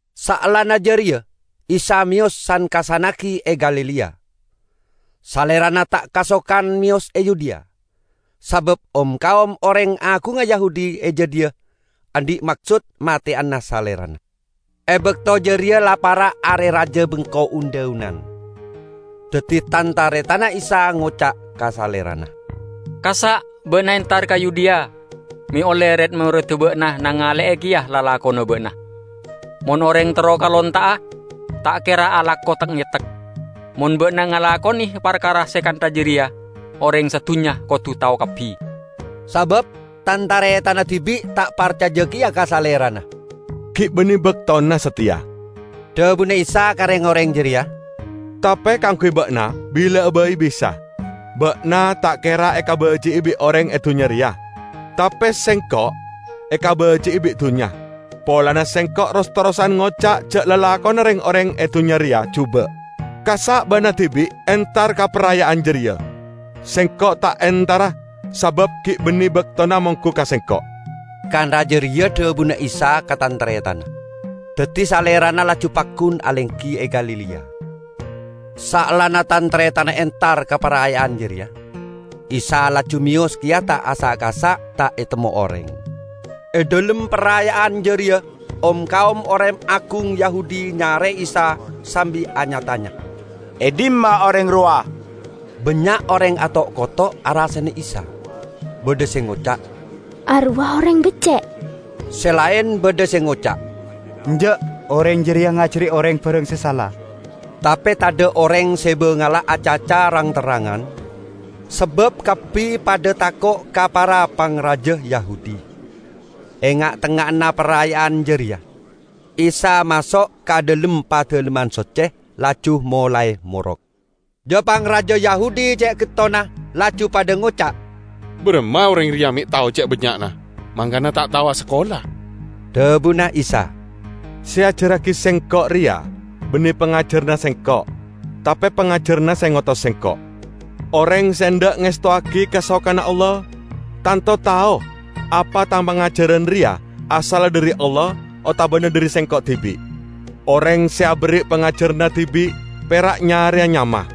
Saellana jareya Isa meyos san-kassannagi e Galilea. Salerana ta' kasokan meyos e Yudea sabab om-kaom oreng agungnga Yahudi e jadhiya andhi' maksod mateyana Salerana. E bakto jareya la para' Are Raja Bengko Un-dhaunan. Daddi tan-taretanna Isa ngoca' ka Salerana, "Kassa' ba'na entar ka Yudea, me' olle red-moredda ba'na nangale'e keya lalakonna ba'na. Mon oreng terro kalonta'a ta' kera alako tek-ngetek. Mon ba'na ngalakone parkara se kantha jareya, oreng sadunnya kodu tao kabbi!" ( Sabab tan-taretanna dibi' ta' parcaja keya ka Salerana.) "Gi' banne baktona sateya," dhabuna Isa ka reng-oreng jareya, "tape kaangguy ba'na bila'a bai bisa. Ba'na ta' kera ekabaji'i bi' oreng e dunnya reya. Tape Sengko' ekabaji'i bi' dunnya, polana Sengko' ros-terrosan ngoca' ja' lalakonna reng-oreng e dunnya reya juba'. Kassa' ba'na dibi' entar ka paraya'an jareya. Sengko' ta' entara sabab gi' banne baktona monggu ka Sengko'." Kantha jareya dhabuna Isa ka tan-taretanna, daddi Salerana laju paggun alenggi e Galilea. Saellana tan-taretanna entar ka paraya'an jareya, Isa laju meyos keya ta' asa'-kasa', ta' etemmo oreng. E dhalem paraya'an jareya om-kaom oreng agung Yahudi nyare'e Isa sambi anya-tanya, "E dhimma oreng rowa?" Bannya' oreng ato'-koto' arasane Isa. Badha se ngoca', "Arowa oreng becce'." Se laen badha se ngoca', "Enja'! Oreng jareya ngajari oreng barang se sala." Tape tadha' oreng se bangala acaca rang-terrangan sabab kabbi padha tako' ka para pangraja Yahudi. E nga'-tengnga'anna paraya'an jareya, Isa maso' ka dhalem Padalemman Socce, laju molae morok. Ja-pangraja Yahudi ce' gettonna, laju padha ngoca', "Baramma oreng reya me' tao ce' bannya'na, mangkana ta' tao asakola?" Dhabuna Isa, "Se eajarragi Sengko' reya banne pangajaranna Sengko', tape pangajaranna se ngotos Sengko'. Oreng se endha' ngestowagi kasokanna Allah, tanto tao apa Tang pangajaran reya asalla dhari Allah otabana dhari Sengko' dibi'. Oreng se aberri' pangajaranna dibi' pera' nyareya nyama.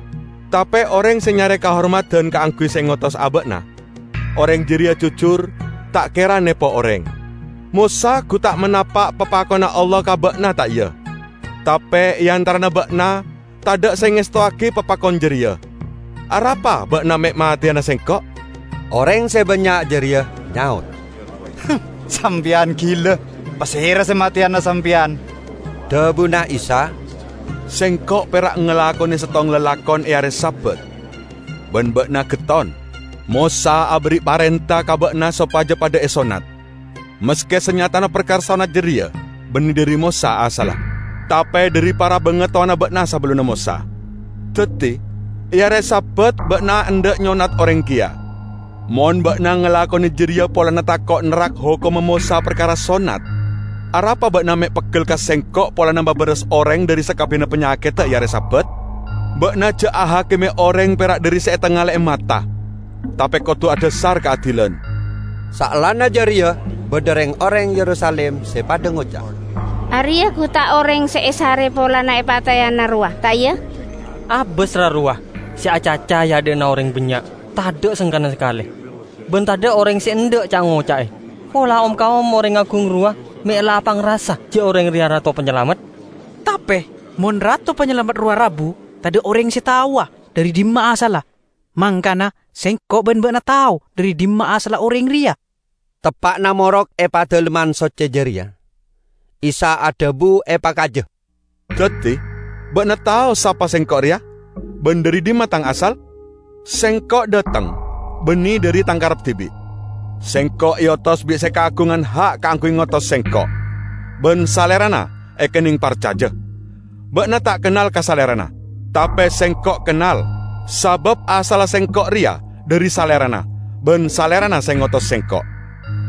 Tape oreng se nyare kahormadan kaangguy se ngotos aba'na, oreng jareya jujur, ta' kera nepo oreng. Mosa gu ta' manapa' papakonna Allah ka ba'na, ta' iya? Tape e antarana ba'na tadha' se ngestowagi papakon jareya. Arapa ba'na me' mateyana Sengko'?" Oreng se bannya' jareya nyaot, "Sampeyan gila! Pasera se mateyana sampeyan?" Dhabuna Isa, "Sengko' pera' ngalakone settong lalakon e are Sabat, ban ba'na getton. Mosa aberri' parenta ka ba'na sopaja padha esonnat, maske sanyatana parkara sonnat jareya banne dhari Mosa asalla, tape dhari para bangatowana ba'na sabellunna Mosa. Daddi e are Sabat ba'na endha' nyonnat oreng keya. Mon ba'na ngalakone jareya polana tako' nerrak hokomma Mosa parkara sonnat, arapa ba'na me' peggel ka Sengko' polana mabaras oreng dhari sakabbiyanna panyakedda e are Sabat? Ba'na ja' ahakime oreng pera' dhari se etangale'e mata, tape kodu adhasar kaadilan." Saellana jareya badha reng-oreng Yerusalim se padha ngoca', "Areya gu ta' oreng se esare polana epateyana rowa, ta' iya? Abas, ra, rowa', se acaca e adha'na oreng bannya' tadha' sengkana sakale, ban tadha' oreng se endha' ca'-ngoca'e! Pola om-kaom oreng agung rowa me' la apangrasa ja' oreng reya Rato Panyalamet? Tape mon Rato Panyalamet rowa rabu, tadha' oreng se taowa dhari dhimma asalla. Mangkana sengko' ban ba'na tao dhari dhimma asalla oreng reya." Teppa'na morok e Padalemman Socce jareya, Isa adhabu epakaja, "Daddi ba'na tao sapa Sengko' reya ban dhari dhimma Tang asal? Sengko' dhateng banne dhari Tang karep dibi'. Sengko' eotos bi' se kaagungan ha' kaangguy ngotos Sengko', ban Salerana ekenneng parcaja. Ba'na ta' kennal ka Salerana, tape Sengko' kennal, sabab asalla Sengko' reya dhari Salerana, ban Salerana se ngotos Sengko'."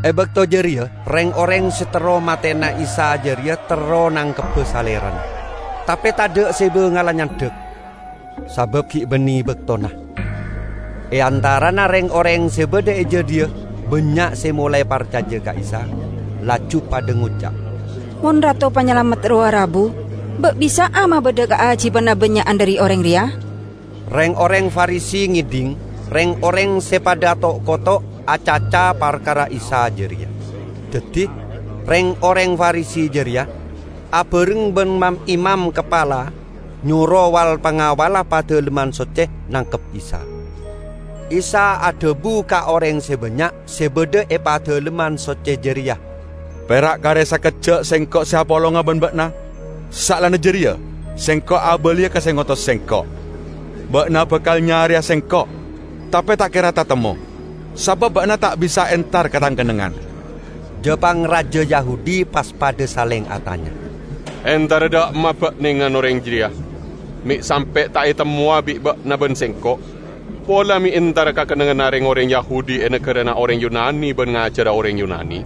E bakto jareya reng-oreng se terro mateyana Isa jareya terro nangkebba Salerana, tape tadha' se bangala nyandhak, sabab gi' banne baktona. E antarana reng-oreng se badha e jadhiya bannya' se molae parcaja ka Isa, laju padha ngoca', "Mon Rato Panyalamet rowa rabu, ba' bisa'a mabadha kaajiban abannya'an dhari oreng reya?" Reng-oreng Farisi ngedhing reng-oreng se padha ato'-koto' acaca parkara Isa jareya. Daddi, reng-oreng Farisi jareya, abareng ban mam-imam kapala nyoro wal-pangawalla Padalemman Socce nangkep Isa. Isa adhabu ka oreng se bannya' se badha e Padalemman Socce jareya, "Pera' kare sakejja' Sengko' se apolonga ban ba'na. Saellana jareya Sengko' abaliya ka se ngotos Sengko'. Ba'na bakal nyareya Sengko', tape ta' kera tatemmo, sabab ba'na ta' bisa entar ka Tang kennengngan." Ja-pangraja Yahudi pas padha saleng atanya, "Entara dha' emma ba'nengan oreng jareya me' sampe' ta' etemmowa bi' ba'na ban sengko'? Pola me' entara ka kennengnganna reng-oreng Yahudi e nagarana oreng Yunani ban ngajara oreng Yunani?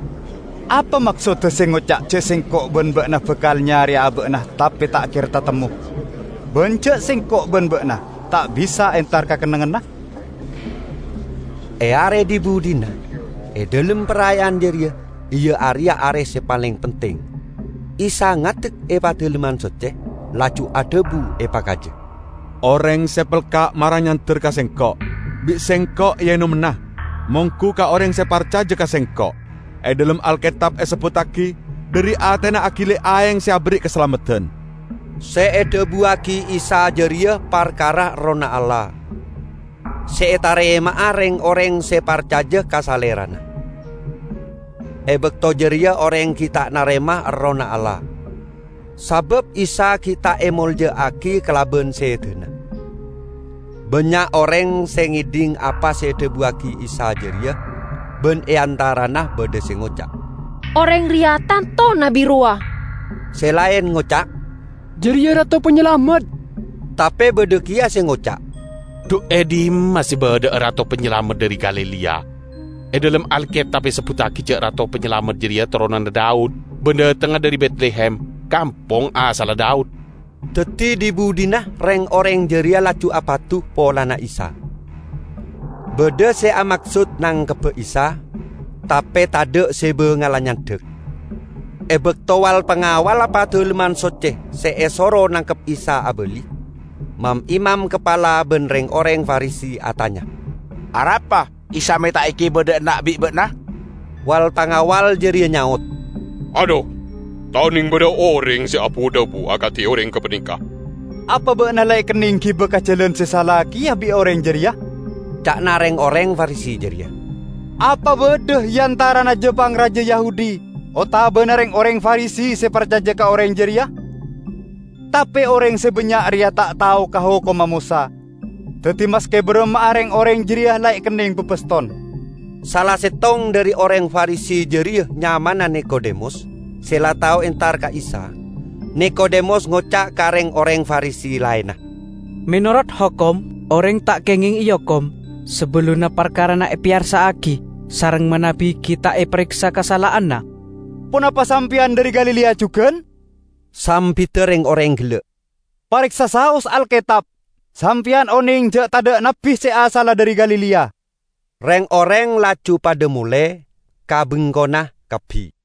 Apa maksodda se ngoca' ja' sengko' ban ba'na bakal nyareya aba'na tape ta' kera tatemmo, ban ja' sengko' ban ba'na ta' bisa entar ka kennengnganna?" E are dhi-budhina e dhalem paraya'an jareya, iya areya e are se paleng penting, Isa ngadek e Padalemman Socce, laju adhabu epakaja, "Oreng se pelka' mara nyander ka Sengko', bi' Sengko' eenommana. Monggu ka oreng se parcaja ka Sengko', e dhalem Alketab esebbuttagi, 'Dhari atena agili aeng se aberri' kasalameddan.' " ( Se edhabuwagi Isa jareya parkara Errohna Allah, se etarema'a reng-oreng se parcaja ka Salerana. E bakto jareya oreng gi' ta' narema Errohna Allah, sabab Isa gi' ta' emolja'agi kalaban sedana.) Bannya' oreng se ngedhing apa se edhabuwagi Isa jareya, ban e antarana badha se ngoca', "Oreng reya tanto Nabbi rowa!" Se laen ngoca', "Jareya Rato Panyalamet!" Tape badha keya se ngoca', "Dhu e dhimma se badha'a Rato Panyalamet dhari Galilea? E dhalem Alketab esebbuttagi ja' Rato Panyalamet jareya toronanna Daud ban dhatengnga dhari Betlehem, kampong asalla Daud." Daddi dhi-budhina reng-oreng jareya laju apadu polana Isa. Badha se amaksod nangkebba Isa, tape tadha' se bangala nyandhak. E bakto wal-pangawalla Padalemman Socce se esoro nangkep Isa abali, mam-imam kapala ban reng-oreng Farisi atanya, "Arapa Isa me' ta' egiba dha' enna' bi' ba'na?" Wal-pangawal jareya nyaot, "Adhu, ta' oneng badha oreng se abu-dhabu akadi oreng gapaneka!" "Apa ba'na la ekenneng giba ka jalan se sala keya bi' oreng jareya?" ca'na reng-oreng Farisi jareya. "Apa badha e antarana ja-pangraja Yahudi otabana reng-oreng Farisi se parcaja ka oreng jareya? Tape oreng se bannya' reya ta' tao ka hokomma Mosa, daddi maske baramma'a reng-oreng jareya la ekenneng babaston." Sala settong dhari oreng Farisi jareya nyamana Nikodemus, se la tao entar ka Isa. Nikodemus ngoca' ka reng-oreng Farisi laenna, "Menorot Hokom, oreng ta' kengeng eokom sabellunna parkarana epeyarsa'agi sareng manabi gi' ta' epareksa kasala'anna." "Ponapa sampeyan dhari Galilea jugan?" sambidda reng-oreng gella'. "Pareksa saos Alketab! Sampeyan oneng ja' tadha' nabbi se asalla dhari Galilea!" [ Reng-oreng laju padha mole ka bengkona kabbi.